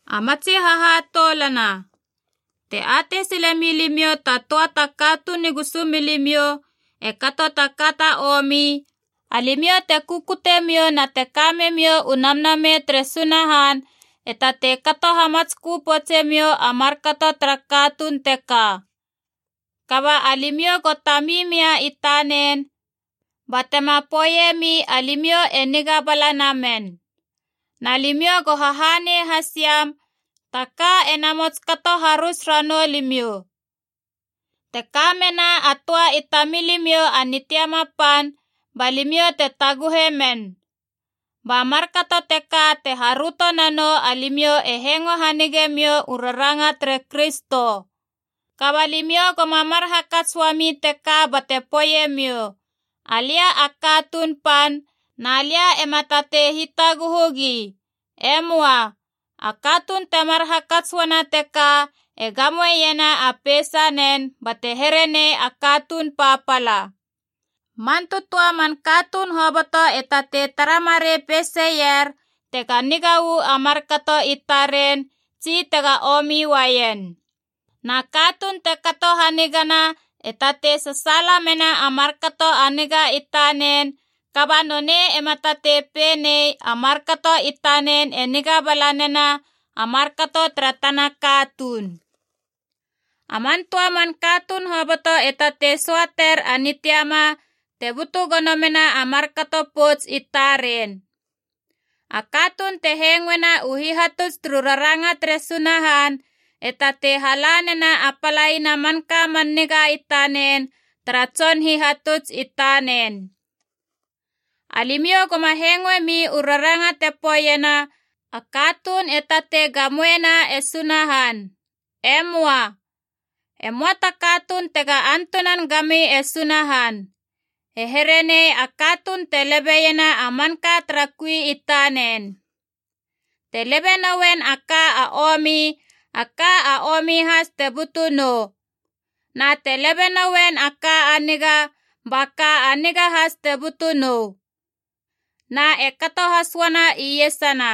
A matsi hahatoulana, te atei sile mia limiou ta töa ta katuun i gusumilimiou e kato ta ka ta omi, alimiou te kukute miou na te kame miou u Namnamei tere Sunahan e tatei kato hamatskö poutsemiou a markato tara katuun teka. Kaba alimiou go tami mia i tanen batema poeiemi alimiou e niga bala namen. Na limiou go hahanei has iam taka ena mots kato harus ranou limiou. Te ka mena a töa i tamilimiou a nitiama pan, ba limiou te taguhe men. Ba markato teka te haröto nanou alimiou e hengo hanigemiou u raranga tere Kristo. Kaba limiou goma mar hakats uami teka bate poeiemiou, Alia a katuun pan na lia ema tatei hitaguhu gi. E möa. A katuun temar hakats uana teka e gamoena a peisanen bate here nei a katuun papala. Man tötöa man katuun hoboto e tatei tara marei peiseier tega niga u a markato i taren tsi tega omi uaien. Na katuun te kato hanigana e tatei sasaala mena a markato a niga i tanen, kaba nonei ema tatei pei nei a markato i tanen e niga bala nena a markato tara tana katuun. A man töa man katuun hoboto e tatei söater a nitiama te butu gono mena a markato pouts i taren. A katuun te hengoena u hihatuts turu raranga tere Sunahan e tatei hala nena a palaina a manka man niga i tanen tara tson hihatuts i tanen. Alimiou goma hengoemi u raranga te poeiena a katuun e tatei gamoena e Sunahan. E möa. E möa ta katuun tega antunan gami e Sunahan. E here nei a katuun te lebe iena a manka tara kui i tanen. Te lebe noen a ka a omi, a ka a omi has te butu nou. Na te lebe noen a ka a niga, ba ka a niga has te butu nou. Na e kato has uana iesana,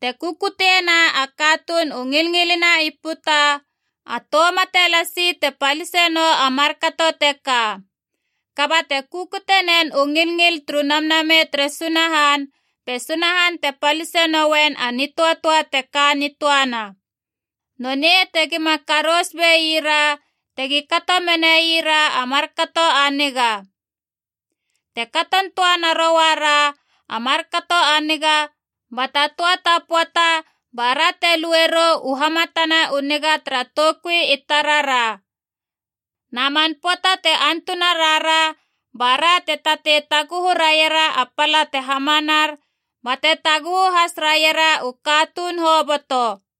te kukutiena a katuun u ngilngilina i puta, a tou mate lasi te palise nou a markato teka. Kaba te kukutie nen u ngilngil turu Namnamei tere Sunahan, be Sunahan te palise noien a nitöatöa te ka nitöana. Nonei tegima karous beira tegi kato menaira a markato a niga. Te katon töa naroara a markato a niga, ba ta töa ta pöata bara te lue rou u hamatana u niga tara toukui i tarara. Na man pöata te antuna rara bara te tatei taguhu raiera a pala te hamanar, bate taguhu has raiera u katuun hoboto.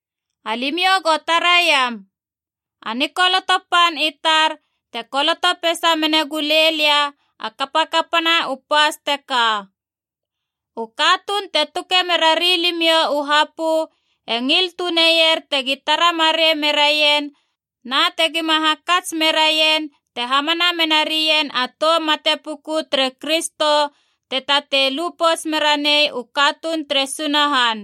Alimiou go taraiam, a nikoloto pan i tar te koloto peisa mena gule lia a kapakapana u pas teka. U katuun te tuke mera rilimiou u hapö e ngil tuneier tegi tara marei meraien na tegi ma ha kamits merain te hamana mena rien a tou mate puku tere Kristo te tatei lu pouts mera nei u katuun tere Sunahan.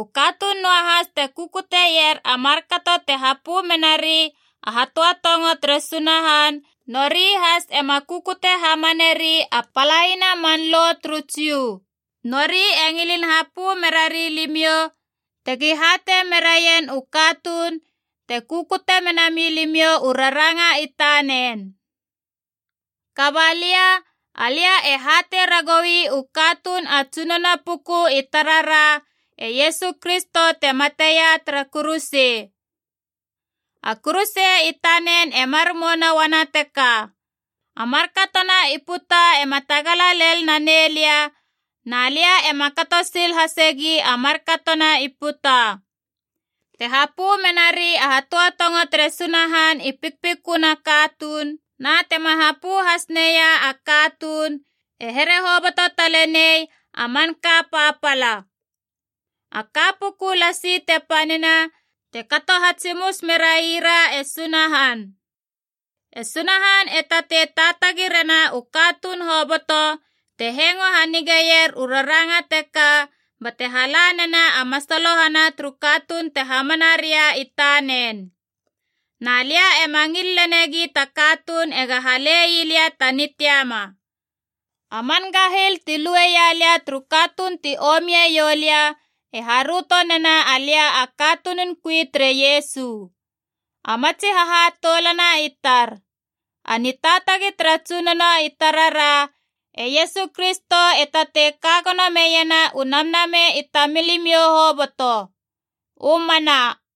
U katuun noahas te kukutier a markato te hapö menari a hatöatongo tere Sunahan, nori has ema kukute hamaneri a palaina a man Lo turu Jiu. Nori e ngilin hapö merari limiou tegi hatei meraien u katuun te kukute menami limiou u raranga i taren. Kaba lia, alia e hatei ragoui u katuun a Tsunono puku i tarara e Iesu Kristo te mateia tara kuruse. A kuruse i tanen e mar mouna uana teka: a markatona i puta ema tagala lel nanei lia, na lia ema kato sil lel hasegi a markatona i puta. Te hapö menari a hatöatongo tere Sunahan i pikpiköna katuun na tema hapö hasneia a katuun, e here hoboto talenei a manka palapala. A ka puku lasi te panina, te kato hatsimus merai ra e Sunahan. E Sunahan e tatei taatagi rena u katuun hoboto te hengo hanigeier u raranga teka, bate hala nena a masalohana turu katuun te hamana ria i tanen. Na lia ema ngil lenegi ta katuun ega hale ii lia ta nitiama. A man gahil tu lueia lia turu katuun ti omie ioulia e haröto nena alia a katunun kui tere Iesu. A matsi hahatoulana i tar, a nitaatagi tara Tsunono i tarara e Iesu Kristo e tatei kagono meiena u namnamei i tamilimiou hoboto. U mana.